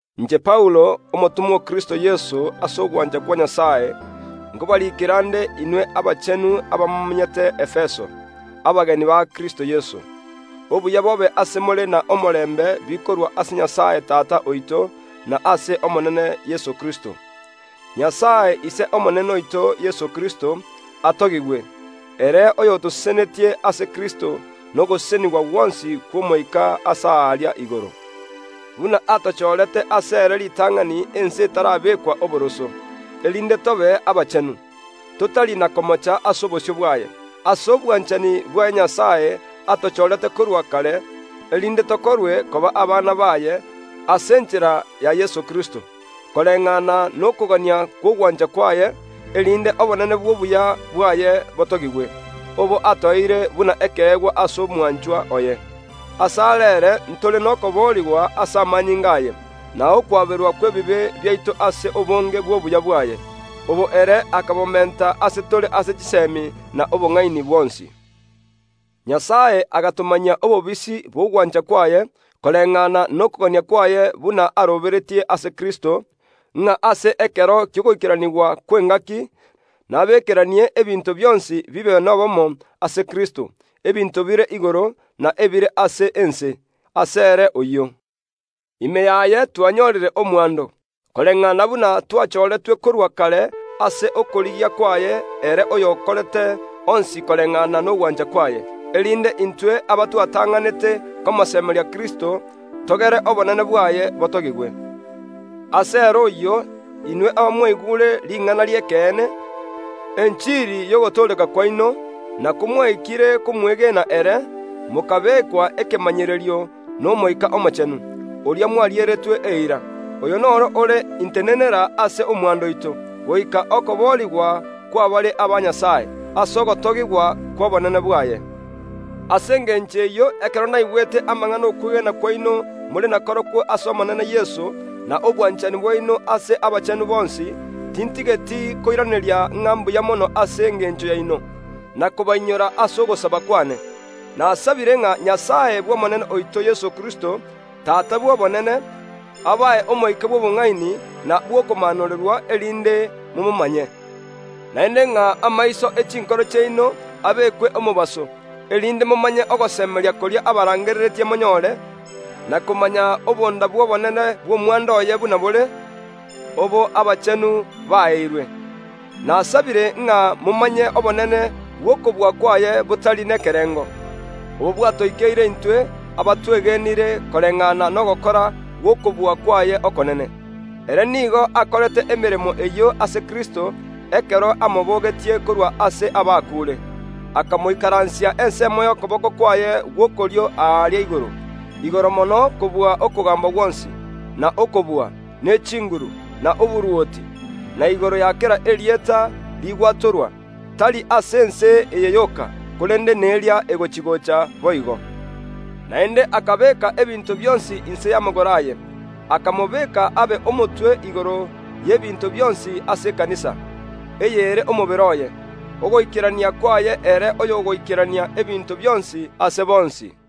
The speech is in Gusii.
Inche Paulo, omotomwa o Kristo Yeso ase ogwancha kwa Nyasae, nkobariikera nde inwe abachenu abamomenyete Efeso, abeegeni ba Kristo Yeso: Obuya bobe ase more na omorembe bikorwa ase Nyasae Tata oito, na ase Omonene Yeso Kristo. Nyasae, Ise Omonene oito Yeso Kristo, atogigwe, ere oyotosesenetie ase Kristo nogosesenigwa gwonsi kw’omoika aase aaria igoro, buna atochoorete ase ere ritang’ani ense etarabekwa oboroso, erinde tobe abachenu, totari na komocha ase obosio bwaye. Ase obwanchani bwaye Nyasae atochorete korwa kare, erinde tokorwe koba abana baye ase enchera ya Yeso Kristo, koreng’ana nokogania kw’ogwancha kwaye, erinde obonene bw’obuya bwaye botogigwe, obo atoeire buna ekeegwa ase Omwanchwa oye. Ase are ere ntore nokoboorigwa ase amanyinga aye, na okwaberwa kw’ebibe biaito ase obonge bw’obuya bwaye, obo ere akabomenta ase tore ase chiseemi na obong’aini bwonsi. Nyasae agatomanyia obobisi bw’ogwancha kwaye, koreng’ana nokogania kwaye buna aroberetie ase Kristo, ng’a ase ekero ki’ogoikeranigwa kw’engaaki nabeekeranie ebinto bionsi bibe n’obomo ase Kristo, ebinto bire igoro, na ebire ase ense, ase ere oyio. Ime yaye twanyorire omwando, koreng’ana buna twachooretwe korwa kare ase okorigia kwaye ere oy’okorete onsi koreng’ana nogwancha kwaye, erinde intwe abatwatang’anete komosemeria Kristo togere obonene bwaye botogigwe. Ase ere oyio, inwe abamwaigure ring’ana ri’ekeene, enchiri y’ogotooreka kwaino, na komwaikire komwegena ere, mokabekwa ekemanyererio n’Omoika Omochenu, oria mwarieretwe eira. Oyo nere ore intenenera ase omwando oito, goika okoboorigwa kw’abare aba Nyasae, ase ogotogigwa kw’obonene bwaye. Ase engencho eyio, ekero naigwete amang’ana y’okwegena kwaino more nakorokwo ase Omonene Yeso, na obwanchani bwaino ase abachenu bonsi, tintigeti koiraneria ng’a mbuya mono ase engencho yaino, na kobainyora ase ogosaba kw’ane. Nasabire ng’a Nyasae Omonene oito Yeso Kristo, Tata Obonene, abae omoika bw’obong’aini na bw’okomaanorerwa, erinde momomanye; naende ng’a amaiso ye chinkoro chiaino abekwe omobaso, erinde momanye ogosemeria koria abarangereretie monyore, na komanya obonda bw’obonene bw’omwando oye buna bore, obo abachenu baeirwe. Nasabire ng’a momanye obonene bw’okobua kwaye botari nekerengo, obo bwatoikeire intwe abatwegenire koreng’ana nogokora gw’okobua kwaye okonene. Ere nigo akorete emeremo eyio ase Kristo ekero amoboogetie korwa ase abakuure, akamoikaransia ensemo y’okoboko kwaye gw’okorio aaria igoro, igoro mono kobua okogaamba gwonsi, na okobua, ne chinguru, na oborwoti, na igoro ya kera erieta rigwatorwa, tari ase ense eye yoka, korende neria egochia‐gocha boigo. Naende akabeeka ebinto bionsi inse y’amagoro aye, akamobeka abe omotwe igoro y’ebinto bionsi ase ekanisa, eyio ere omobere oye, ogoikerania kwaye ere oyogoikerania ebinto bionsi ase bonsi.